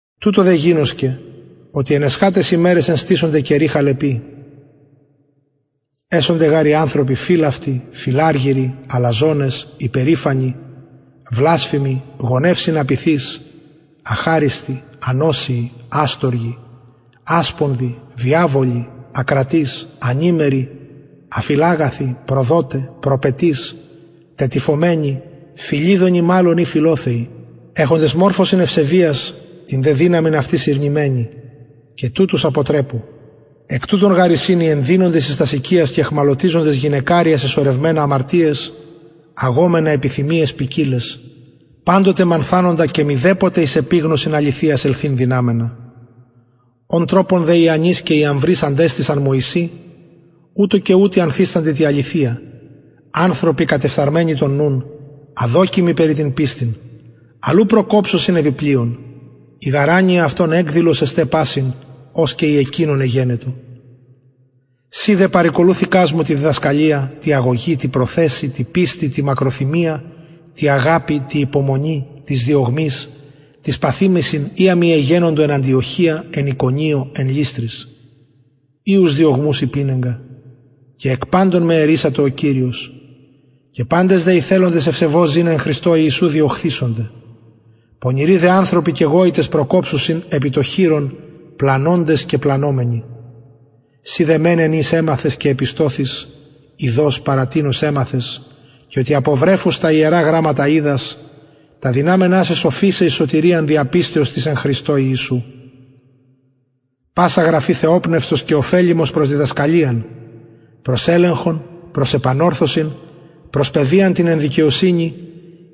τουτο δε γινωσκε οτι εν εσχαταις ημεραις ενστησονται καιροι χαλεποι εσονται γαρ οι ανθρωποι φιλαυτοι φιλαργυροι αλαζονες υπερηφανοι βλασφημοι γονευσιν απειθεις αχαριστοι ανοσιοι αστοργοι ασπονδοι διαβολοι ακρατεις ανημεροι αφιλαγαθοι προδοται προπετεις τετυφωμενοι φιληδονοι μαλλον η φιλοθεοι εχοντες μορφωσιν ευσεβειας την δε δυναμιν αυτης ηρνημενοι και τουτους αποτρεπου εκ τουτων γαρ εισιν οι ενδυνοντες εις τας οικιας και αιχμαλωτευοντες γυναικαρια σεσωρευμενα αμαρτιαις αγομενα επιθυμιαις ποικιλαις παντοτε μανθανοντα και μηδεποτε εις επιγνωσιν αληθειας ελθειν δυναμενα ον τροπον δε ιαννης και ιαμβρης αντεστησαν μωυση ουτως και ουτοι ανθιστανται τη αληθεια ανθρωποι κατεφθαρμενοι τον νουν αδοκιμοι περι την πιστιν αλλ ου προκοψουσιν επι πλειον η γαρ ανοια αυτων εκδηλος εσται πασιν ως και η εκεινων εγενετο συ δε παρηκολουθηκας μου τη διδασκαλια τη αγωγη τη προθεσει τη πιστει τη μακροθυμια τη αγαπη τη υπομονη τοις διωγμοις τοις παθημασιν οια μοι εγενετο εν αντιοχεια εν ικονιω εν λυστροις οιους διωγμους υπηνεγκα και εκ παντων με ερρυσατο ο κυριος και παντες δε οι θελοντες ευσεβως ζην εν χριστω ιησου διωχθησονται πονηροι δε ανθρωποι και γοητες προκοψουσιν επι το χειρον πλανωντες και πλανωμενοι συ δε μενε εν οις εμαθες και επιστωθης ειδως παρα τινος εμαθες και οτι απο βρεφους τα ιερα γραμματα οιδας τα δυναμενα σε σοφισαι εις σωτηριαν δια πιστεως της εν χριστω ιησου πασα γραφη θεοπνευστος και ωφελιμος προς διδασκαλιαν προς ελεγχον προς επανορθωσιν προς παιδειαν την εν δικαιοσυνη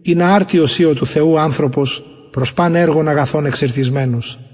ινα αρτιος η ο του θεου ανθρωπος προς παν εργον αγαθον εξηρτισμενος